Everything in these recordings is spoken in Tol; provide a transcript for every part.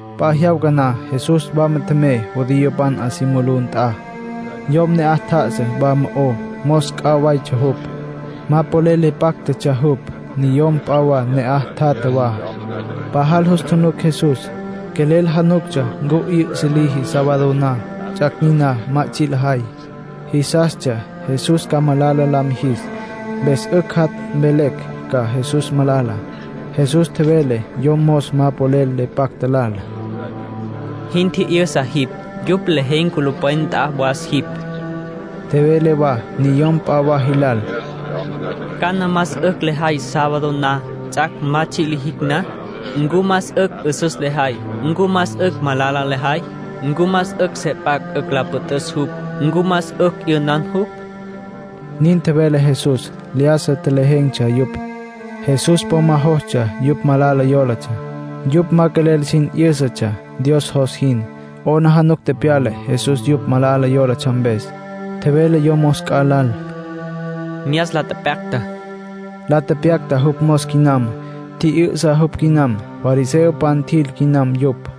P'a jyawca na Jesús wama tjemey judiopan 'a si mulú nt'a. Yom ne'aj tjá'asa wa mo'ó, mos c'a waytsja jupj. Ma polel le páctatsja jupj. Niyom p'a wa ne'aj tjatja wa. Pajal jus tjunuc Jesús, quelel januctsja ncu 'yü'sa liji sábado na, ts'ac' niná ma tsji' lajay. Jisastsja Jesús ca malala la mijis, mpes 'ücj jat' mvelecj ca Jesús malala. Jesús tjevele yom mos ma polel le pacta lal: —Jin tjijyünsa jipj. Yupj lejen̈ culupwen nt'a was jipj. Tjevele wa niyom p'a wa jilal: —¿Cana más 'ücj lejay sábado na, ts'ac' ma tsji' lijicj na? ¿Ncu más 'ücj 'üsüs lejay, ncu más 'ücj malala lejay? ¿Ncu más 'ücj se p'acj 'ücj la püt'üs jupj, ncu más 'ücj 'yünan jupj? —nin tjevele Jesús. Lyájasa tjelejen̈tsja yupj. Jesús po ma jostsja yupj malala yólatsja; yupj ma quelel sin 'yǘsatsja Dios jos jin. 'Aplijila tepyala Jesús yupj malala yólatsja mpes. Tjevele yom mos c'a lal: —Myas la tepyacta. La tepyacta jupj mos quinam. Tji'yü'sa jupj quinam. Fariseopan tjil quinam yupj.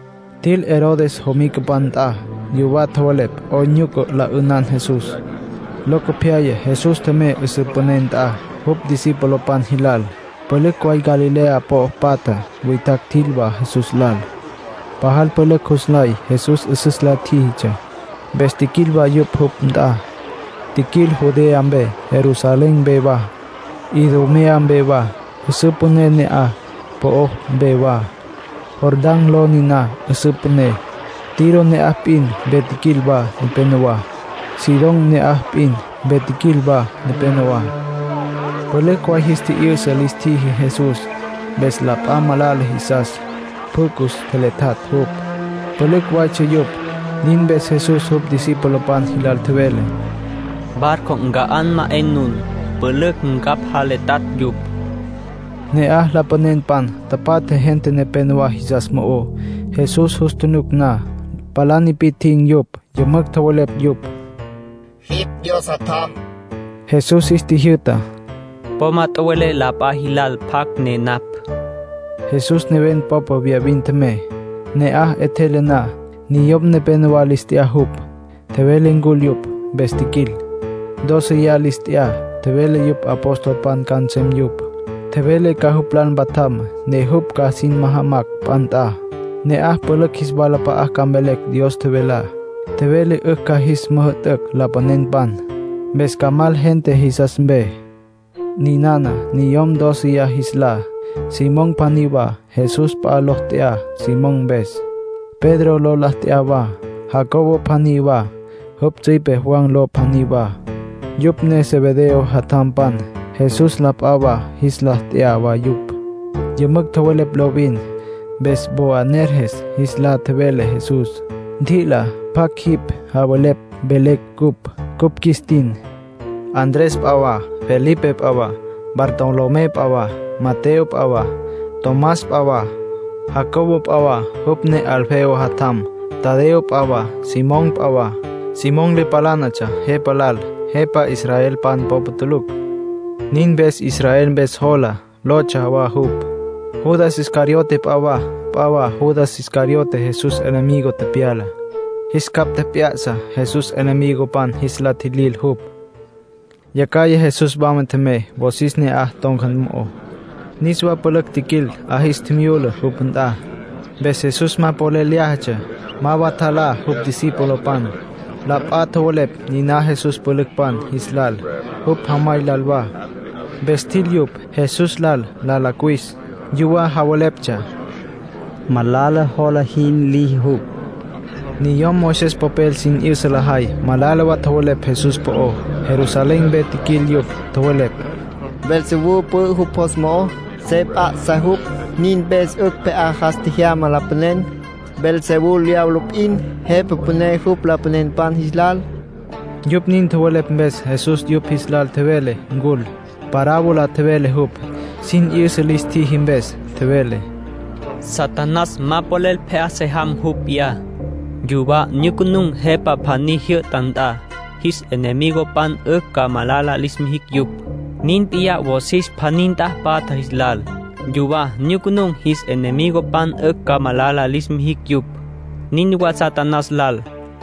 Tjil Herodes jomicapan nt'a. Yuwá tjowelepj 'oyn nyuca la 'ünan Jesús. Locopyaya Jesús tjemey 'üsǘ püné nt'a jupj discipulopan jilal. Pülücj way Galilea po'o patja witjacj tjil wa Jesús lal. Pajal pülücj jus nlay Jesús 'üsüs la tjíjitsja. Mpes tjiquil wa yupj jupj nt'a. Tjiquil Judea mpe, Jerusalén mpe wa, Idumea mpe wa, 'üsǘ püné na'aj po'ó mpe wa. (Jordán ló niná 'üsǘ püné.) Tiro ne'aj p'in mpe tjiquil wa nepenowá. Sidón ne'aj p'in mpe tjiquil wa nepenowá. Pülücj way jis tji'yü'sa lis tjiji Jesús. Mpes la p'a malala jisastsja pjü cus tjeletjatj jupj. Pülücj waytsja yupj. Nin mpes Jesús jupj discipulopan jilal tjevele: “Barco nca'á ma 'e nun. Pülücj ncapj jaletjatj yupj.” Ne'aj lapanenpan tapatja gente nepénowa jisas mo'ó. Jesús jus tjunuc na, palá nipi'tjin̈ yupj. Yümücj tjowelepj yupj: —Jipj Dios Jatjam. Jesús jis tjijyü'ta: —Po ma tjowelé la p'a jilal pjacj ne napj. Jesús neven popa viyavin tjemey. Ne'aj 'etjele na, niyom nepénowa lis t'ya jupj. Tjevele ncul yupj, mpes tjiquil. Dóceya lis t'ya, tjevele jupj apostolpan ca nsem yupj. Tjevele ca jupj lal mpatjam, ne jupj ca sin majamas p'a nt'a. Ne'aj pülücj jis walap'a'a ca mvelecj Dios tjevelá. Tjevele 'ücj ca jis müjü'tücj lapanenpan, mpes ca mal gente jisas mpe. Ninana niyom dóceya jis lá: Simón pjaní wa (Jesús p'a ló la t'ya Simón mpes. Pedro ló la t'ya wa.) Jacobo pjaní wa, jupj tsüipe Juan ló pjaní wa, yupj ne Zebedeo jatjampan (Jesús la p'a jis lá lis t'ya wa yupj. Yümücj tjowelepj lovin, mpes Boanerges jis lá tjevele Jesús. T'i'ila pjac jin javelepj velecj cupj, cupj qjuis tin.) Andrés p'a wa, Felipe p'a wa, Bartolomé p'a wa, Mateo p'a wa, Tomás p'a wa, Jacobo p'a wa, jupj ne Alfeo jatjam; Tadeo p'a wa, Simón p'a wa (Simón le palánatsja jepa lal, jepa israelpan popa tulucj. Nin mpes “Israel Mpes Jola” lotsja wa jupj.) Judas Iscariote p'a wa. P'a jawas Judas Iscariote Jesús enemigo tepyala. Jis capj tjep'ya'sa Jesús enemigopan jis la tjilil jupj. Yacjaya Jesús wama tjemey wosis ne'aj ton̈ca mo'ó. Niswa pülücj tjiquil, 'a jis tjimyula jupj nt'a. Mpes Jesús ma polel lyájatsja, ma wa tjalá jupj discipulopan. La p'a tjowelepj niná Jesús pülücpan jis lal, jupj jamay lal wa. Mpes tjil yupj, Jesús lal la cuwis. Yuwá javeleptsja: “Malala jola jin liji jupj”. Niyom Moisés popel sin 'yüsa lajay malala wa tjowelepj Jesús po'ó. Jerusalén mpe tjiquil yupj. Tjowelepj: “Beelzebú pü'ü jupj jos mo'ó, se p'a'sa jupj. Nin mpes 'ücj pje'á jas tjejyama lapanen. Beelzebú diablo p'in. Jepa püné jupj lapanenpan jis lal.” Yupj nin tjowelepj mpes Jesús yupj jis lal tjevele ncul. Parábola tjevele jupj, sin 'yüsa lis tjiji mpes. Tjevele: “Satanás ma polel pje'á se jamá jupj p'iyá. Yuwá nyucunun̈ jepa pjaní jyü'ta nt'a, jis enemigopan 'ücj ca malala lis mijicj yupj. Nin p'iyá wosis pjaní nt'a patja jis lal. Yuwá nyucunun̈, jis enemigopan 'ücj ca malala lis mijicj yupj. Nin wa Satanás lal.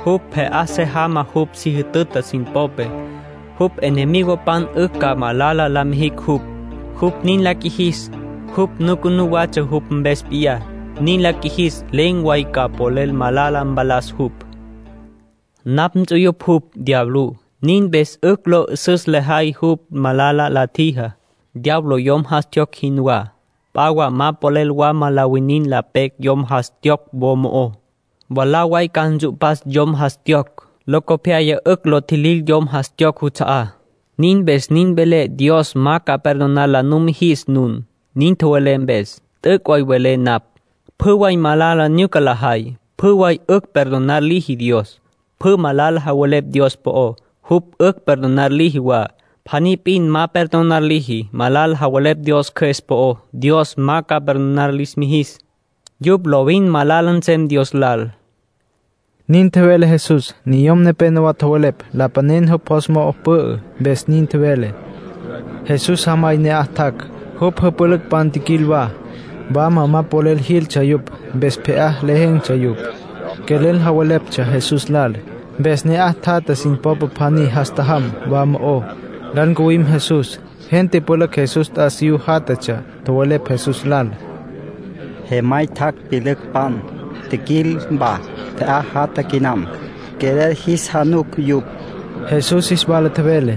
Jupj pje'á se jamá jupj si jütüta sin popé, jupj enemigopan 'ücj ca malala la mijicj jupj. Jupj nin la qjuijis, jupj nucunú watsja jupj mpes p'iyá. Nin la qjuijis, len̈ way ca polel malala mpalas jupj. ”Napj tsyupapj jupj, diablú. Nin mpes 'ücj lo 'ü'süs lejay jupj malala la tjijá. Diablo yom jas tjiyocj jinwá. P'a wa ma polel wama la winin la pecj yom jas tjiyocj wo mo'ó. Mwalá way ca ntsu'pas yom jas tjiyocj. Locopyaya 'ücj lo tjilil yom jas tjiyocj juts'a'á. ”Nin mpes nin velé Dios ma ca perdonar la numijis nun, nin tjowelé mpes. T'üc' way velé napj. Pjü way malala nyuca lajay, pjü way 'ücj perdonar liji Dios. Pjü malala javelepj Dios po'ó, jupj 'ücj perdonar liji wa. Pjaní p'in ma perdonar liji. Malala javelepj Dios Cjües po'ó, Dios ma perdonar lis mijis. Yupj lovin malala nsem Dios lal.” Nin tjevele Jesús. Niyom nepénowa tjowelepj lapanen jupj jos mo'o pü'ü, mpes nin tjevele. Jesús jamay ne'aj tjac', jupj jüpülücpan tjiquil wa. Wama ma polel jiltsja yupj, mpes pje'á lejen̈tsja yupj. Quelel javeleptsja Jesús lal. Mpes ne'aj tjatja sin popa pjaní jas tjajam wa mo'ó, lal ncuwim Jesús. Gente pülücj Jesús t'asiyú játjatsja, tjowelepj Jesús lal: —Jemay tjac', pyülücpan tjiquil wa, pje'á jatja quinam. Quelel jis januc yupj. Jesús jis wala tjevele: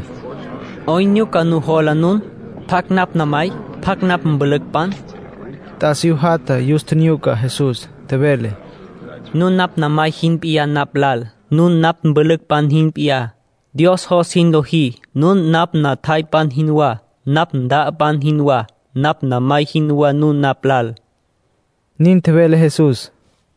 —¿'Oyn nujola nun? ¿Pjacj napj namay? ¿Pjacj napj mpülücpan? T'asiyú jatja yus tjinyuca Jesús, tjevele: —Nun napj namay jin p'iyá napj lal. Nun napj mpülücpan jin p'iyá. Dios jos jin lojí, nun napj natjaypan jinwá, napj nta'apan jinwá, napj namay jinwá nun napj lal —nin tjevele Jesús.